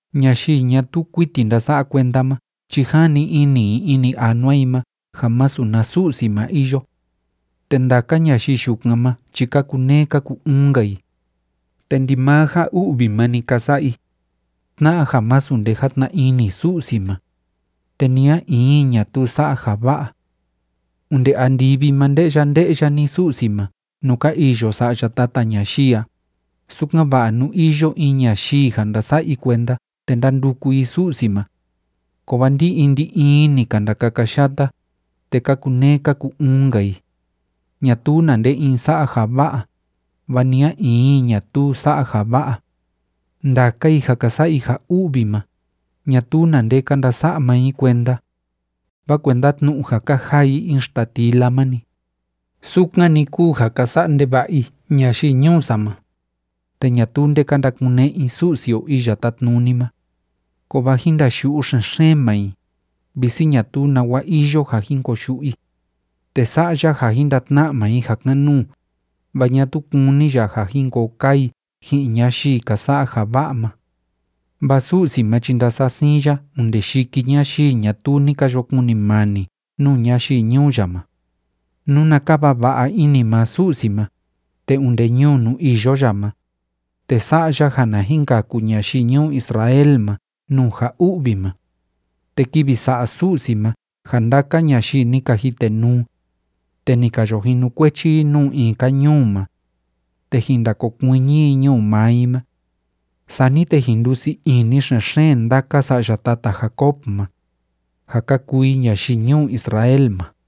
Ñayii ñatuu kuiti ndása'a kuenda ma chi jani ini i ini anua i ma ja masu na Su'si ma iyo. Te ndaka ñayii yukan ma chi ka kuneé ka ku‑uun‑nka i, te ndimaa ja u'vi ma‑ni ka sa'a i, tna'a ja masu nde játna ini Su'si ma. Te ni a in i ñatuu sa'a ja va'a. Onde andivi ma nde'ya nde'ya‑ni Su'si ma nuu ka iyo sa'ya tata ñayii a, sukan‑va'a nú iyo in ñayii ja ndása'a i kuenda te ndánduku i Su'si ma. Kovaa ndi‑in ndi‑in i ni ka ndakakayata, te ka kuneé ka ku‑uun‑nka i. Ñatuu na nde in sa'a ja va'a, vaa ni a in i ñatuu sa'a ja va'a. Ndaka i ja ka sa'a i ja u'vi ma, ñatuu na nde ka ndasa'a maa i kuenda, vaa kuenda tnu'u ja ka jaa i in xtatila ma‑ni, sukan‑ni kúu ja ka sa'a ndeva'a i ñayii ñuu sa ma, te ñatuu nde ka ndakune'e i Su'si o Iya Tátnuni ma. Kovaa jin ndayu'u xen‑xeen maa i, visi ñatuu nawa iyo ja jin koyu'u i. Te sa'a ya ja jin ndatna'a maa i ja kan‑nuu, vaa ñatuu kúni ya ja jin koo kaa i ji'in ñayii ka sa'a ja va'a ma. Vaa Su'si ma chi ndasa'a siin ya onde yiki ñayii ñatuu ni ka yo kunimani nuu ñayii ñuu ya ma. ¡Nuna kava va'a ini maa Su'si ma, te onde ñuu nuu iyo ya ma, te sa'a ya ja na jin kaku ñayii ñuu Israel ma nuu ja u'vi ma! Te kivi sa'a Su'si ma ja ndaka ñayii ni ka jitenuu te ni ka yo jinukuechi i nuu in‑ka ñuu ma, te jin ndakokuiñi i ñuu maa i ma. Sani te jin ndusii ini xen‑xeen ndaka sa'ya tata Jacob ma, ja ka kuu i ñayii ñuu Israel ma.